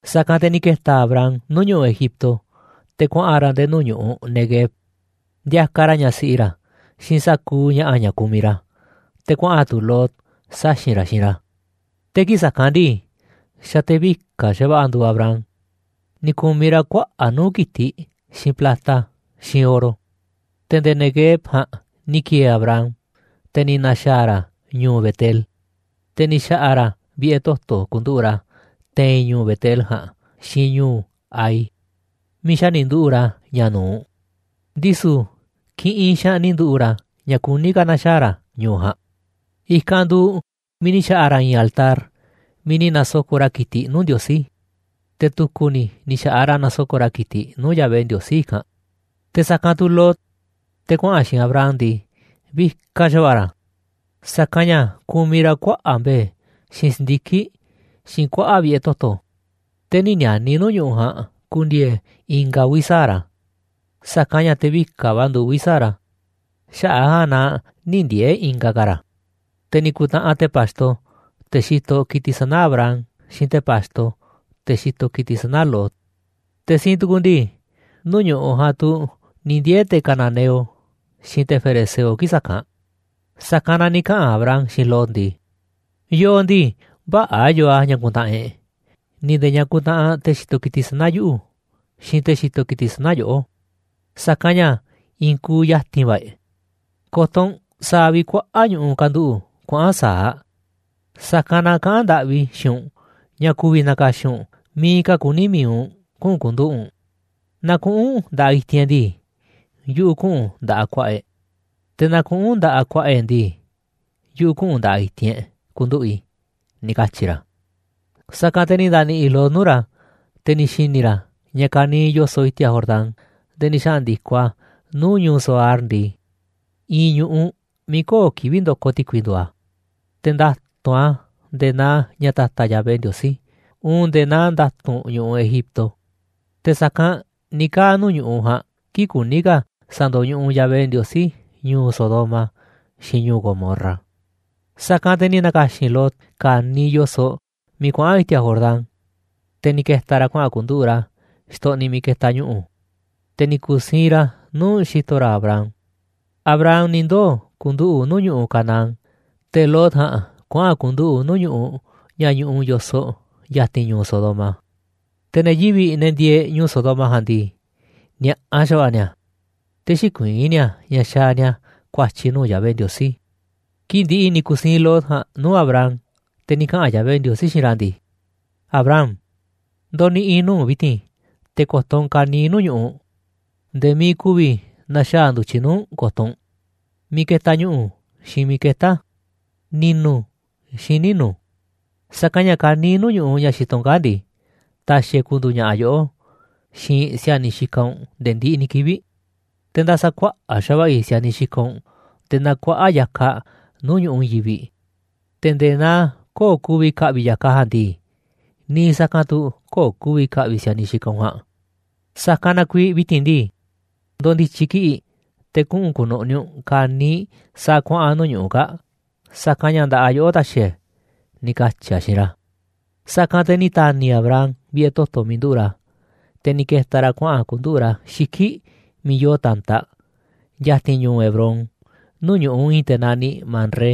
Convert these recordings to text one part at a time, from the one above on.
Sa̱kanꞌ te̱ ni̱ ke̱ta̱ Abram nuu̱ꞌ ñu̱ꞌuꞌ Egipto te̱ kuaꞌa̱n ra̱ nde̱e̱ nuu̱ꞌ ñu̱ꞌuꞌ Neguev, ndiakaꞌ ra̱ ñaꞌ siꞌi ra̱, xiinꞌ sa̱kuuꞌ ña̱ꞌa̱ ña̱ kumiꞌ ra̱, te̱ kuaꞌa̱n tu̱ Lot, saxi̱n ra̱, xiinꞌ ra̱. Te̱ kii̱ꞌ sa̱kanꞌ ndii, xa̱ te̱ vika̱ꞌ xa̱va̱ꞌa̱ nduuꞌ Abram, ni̱ ku̱miꞌ ra̱ kuaꞌa̱ꞌ nuu̱ꞌ ki̱tiꞌ, xiinꞌ plata, xiinꞌ oro. Te̱ nde̱e̱ Neguev ja̱a̱nꞌ ni̱ ki̱e̱e̱ Abram, te̱ ni̱ na̱xa̱a̱ ra̱ ñu̱u̱ Betel, te̱ ni̱ xa̱ꞌa̱ ra̱ vi̱ꞌe̱ toto̱ ku̱nduꞌu̱ꞌ ra̱ te̱i̱n ñu̱u̱ Betel ja̱a̱nꞌ xiinꞌ ñu̱u̱ Hai, miiꞌ xa̱ ni̱ nduꞌu̱ꞌ ra̱ ña̱ nu̱uꞌ. Ndisu̱ kiꞌinꞌ xaanꞌ ni̱ nduꞌu̱ꞌ ra̱ ña̱ kuní ka̱ na̱xaa̱ ra̱ ñu̱u̱ ja̱a̱nꞌ. I̱kanꞌ nduuꞌ miiꞌ ni̱ xa̱ꞌa̱ ra̱ i̱i̱n altar miiꞌ ni̱ na̱soko̱ꞌ ra̱ ki̱tiꞌ nuu̱ꞌ Ndiosí, te̱ tu̱ku̱ ni̱ ni̱ xa̱ꞌaꞌ ra̱ na̱soko̱ꞌ ra̱ ki̱tiꞌ nuu̱ꞌ Yahvé Ndiosí i̱kanꞌ. Te̱ sa̱kanꞌ tu̱ Lot, te̱ kuaꞌa̱n xiinꞌ Abram ndii, vikaꞌ xa̱va̱ꞌa̱ ra̱, sa̱kanꞌ ña̱ kumiꞌ ra̱ kuaꞌa̱ꞌ mbe̱e̱, xiinꞌ si̱ndiki̱ꞌ, xiinꞌ kuaꞌa̱ꞌ vi̱ꞌe̱ toto̱. Te̱ nï̱ ni̱a̱ni̱ nuu̱ꞌ ñu̱ꞌuꞌ ja̱a̱nꞌ ku̱ndi̱e̱e̱ ingaꞌ uvi̱ sa̱aꞌ ra̱, sa̱kanꞌ ña̱ te̱ vikaꞌ va̱ nduuꞌ uvi̱ sa̱aꞌ ra̱, xaꞌa̱ꞌ ja̱a̱nꞌ na nï̱ ndiee̱ ingaꞌ ka̱ ra̱. Te̱ ni̱ ku̱ntaꞌanꞌ te̱ pa̱xto, te̱ xitoꞌ ki̱tiꞌ sana̱ Abram, xiinꞌ te̱ pa̱xto, te̱ xitoꞌ ki̱tiꞌ sana̱ Lot. Te̱ siinꞌ tu̱ku̱ ndii, nuu̱ꞌ ñu̱ꞌuꞌ ja̱a̱nꞌ tu̱ ni̱ ndiee̱ te̱ cananeo, xiinꞌ te̱ ferezeo kii̱ꞌ sa̱kanꞌ. Sa̱kanꞌ na ni̱ kaꞌa̱n Abram xiinꞌ Lot ndii: ―Yooꞌ ndii, vä̱ꞌa̱ yoo a̱ ña̱ kuntaꞌanꞌ e̱ꞌ, ni̱ nde̱e̱ ña̱ kuntaꞌanꞌ te̱ xitoꞌ ki̱tiꞌ sana̱ yuꞌu̱, xiinꞌ te̱ xitoꞌ ki̱tiꞌ sana̱ yoꞌó, sa̱kanꞌ ña̱ i̱i̱n kuuꞌ ya̱ti̱n va̱ e̱ꞌ. Ko̱to̱ u̱nꞌ sa̱a̱ vi̱ꞌ kuaꞌa̱ꞌ ñu̱ꞌuꞌ kanduꞌu̱ꞌ kuaꞌa̱n sa̱aꞌ. Sa̱kanꞌ na kaꞌán ndaꞌvi i̱ xiinꞌ u̱nꞌ ña̱ ku̱vi̱ na̱ka̱xi̱n u̱nꞌ miiꞌ ka̱ kuní mi̱iꞌ u̱nꞌ kuꞌu̱n ku̱nduꞌu̱ꞌ u̱nꞌ, naaꞌ kuꞌu̱n u̱nꞌ nda̱ꞌaꞌ i̱ti̱n e̱ꞌ ndii, yuꞌu̱ kuꞌu̱n nda̱ꞌaꞌ ku̱a̱ꞌa̱ e̱ꞌ, te̱ naaꞌ kuꞌu̱n u̱nꞌ nda̱ꞌaꞌ ku̱a̱ꞌa̱ e̱ꞌ ndii, yuꞌu̱ kuꞌu̱n nda̱ꞌaꞌ i̱ti̱n e̱ꞌ ku̱nduꞌu̱ꞌ i̱ ―ni̱ katyi̱ ra̱. Sa̱kanꞌ te̱ ni̱ nda̱ni̱ꞌi̱ Lot nuu̱ꞌ ra̱, te̱ ni̱ xi̱ni̱ ra̱ ña̱ ka̱niiꞌ yo̱soꞌ i̱ti̱a̱ Jordán nde̱e̱ ni̱ xandi̱koꞌ a̱ nuu̱ꞌ ñu̱u̱ Zoar ndii, i̱i̱n ñu̱ꞌuꞌ miiꞌ köo̱ꞌ kivi̱ꞌ ndokoꞌ ti̱kui nduuꞌ a̱, te̱ nda̱tu̱nꞌ a̱ nde̱e̱ naa ña̱ ta̱ta̱ Yahvé Ndiosí, uun nde̱e̱ naa nda̱tu̱nꞌ ñu̱ꞌuꞌ Egipto. Te̱ sa̱kanꞌ ni̱ kaa̱ꞌ nuu̱ꞌ ñu̱ꞌuꞌ ja̱a̱nꞌ kii̱ꞌ kuní ka̱ sa̱ndo̱ñuꞌuꞌ Yahvé Ndiosí ñu̱u̱ Sodoma xiinꞌ ñu̱u̱ Gomorra. Sa̱kanꞌ te̱ ni̱ na̱ka̱xi̱n Lot ka̱niiꞌ yo̱soꞌ miiꞌ kuaꞌa̱n i̱ti̱a̱ Jordán, te̱ ni̱ ke̱ta̱ ra̱ kuaꞌa̱n ku̱nduꞌu̱ꞌ ra̱ xtoꞌniꞌ miiꞌ ketaꞌ ñu̱ꞌu̱, te̱ ni̱ ku̱siinꞌ ra̱ nuu̱ꞌ xi̱to̱ ra̱ Abram. Abram ni̱ ndoo̱ ku̱nduꞌu̱ꞌ nuu̱ꞌ ñu̱ꞌuꞌ Canaán, te̱ Lot ja̱a̱nꞌ kuaꞌa̱n ku̱nduꞌu̱ꞌ nuu̱ꞌ ñu̱ꞌuꞌ ña̱ ñuꞌuꞌ yo̱soꞌ ya̱ti̱n ñu̱u̱ Sodoma. Te̱ ne̱ yivi̱ꞌ, ne̱ ndieeꞌ ñu̱u̱ Sodoma ja̱a̱nꞌ ndii, ni̱a̱ꞌa xa̱va̱ꞌa̱ ni̱a̱, te̱ xïkuiín ni̱a̱ ña̱ xaaꞌ ni̱a̱ ku̱a̱tyi̱ nuu̱ꞌ Yahvé Ndiosí. Kii̱ꞌ ndi̱ꞌi̱ ni̱ ku̱siinꞌ Lot ja̱a̱nꞌ nuu̱ꞌ Abram, te̱ ni̱ kaꞌa̱n Yahvé Ndiosí xiinꞌ ra̱ ndii: ―Abram, ndo̱ni̱ꞌi̱ nuu̱ꞌ u̱nꞌ vi̱ti̱n, te̱ ko̱to̱ u̱nꞌ ka̱niiꞌ nuu̱ꞌ ñu̱ꞌuꞌ, nde̱e̱ miiꞌ ku̱vi̱ na̱xaa̱ ndu̱tyiꞌ nuu̱ꞌ u̱nꞌ ko̱to̱ u̱nꞌ, miiꞌ ketaꞌ ñu̱ꞌu̱, xiinꞌ miiꞌ ketá a̱, ni̱nu̱, xiinꞌ ninu̱. Sa̱kanꞌ ña̱ ka̱niiꞌ ñu̱ꞌuꞌ ña̱ xitoꞌ u̱nꞌ kaa̱ꞌ ndii, ta̱xi̱ e̱ꞌ ku̱ndu̱u̱ ña̱ꞌa̱ yoꞌó, xiinꞌ si̱a̱niꞌ xikaꞌ u̱nꞌ nde̱e̱ ndiꞌiꞌ ni̱ kivi̱ꞌ. Te̱ nda̱sa̱kuaꞌa̱ꞌ xa̱va̱ꞌa̱ i̱ si̱a̱niꞌ xikaꞌ u̱nꞌ, nde̱e̱ naa kuaꞌa̱ꞌ ya̱kaꞌ nuu̱ꞌ ñu̱ꞌuꞌ i̱i̱n yivi̱ꞌ, te̱ nde̱e̱ naa köo̱ꞌ ku̱vi̱ kaꞌviꞌ ya̱kaꞌ ja̱a̱nꞌ ndii, niiꞌ sa̱kanꞌ tu̱ köo̱ꞌ ku̱vi̱ ka̱ꞌvi̱ si̱a̱niꞌ xikaꞌ u̱nꞌ ja̱a̱nꞌ. Sa̱kanꞌ na kuiiꞌ vi̱ti̱n ndii, ndo̱ndi̱tyi̱ kiꞌi̱ꞌ, te̱ kuꞌu̱n ku̱nu̱ꞌni̱ u̱nꞌ ka̱niiꞌ sa̱a̱ kuaꞌa̱n nuu̱ꞌ ñu̱ꞌuꞌ kaa̱ꞌ, sa̱kanꞌ ña̱ nda̱ꞌaꞌ yoꞌó ta̱xi̱ e̱ꞌ e̱ ―ni̱ katyi̱ a̱ xiinꞌ ra̱. Sa̱kanꞌ te̱ ni̱ ta̱ni̱ Abram vi̱ꞌe̱ toto̱ miiꞌ nduꞌu̱ꞌ ra̱, te̱ ni̱ ke̱ta̱ ra̱ kuaꞌa̱n ku̱nduꞌu̱ꞌ ra̱ xiki̱ꞌ miiꞌ yoo ta̱ntaꞌ, ya̱ti̱n ñu̱u̱ Hebrón, nuu̱ꞌ ñu̱ꞌuꞌ i̱i̱n te̱ naniꞌ Mamré,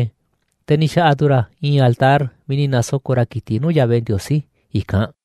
te̱ ni̱ xa̱ꞌa̱ tu̱ ra̱ i̱i̱n altar miiꞌ ni̱ na̱soko̱ꞌ ra̱ ki̱tiꞌ nuu̱ꞌ Yahvé Ndiosí i̱kanꞌ.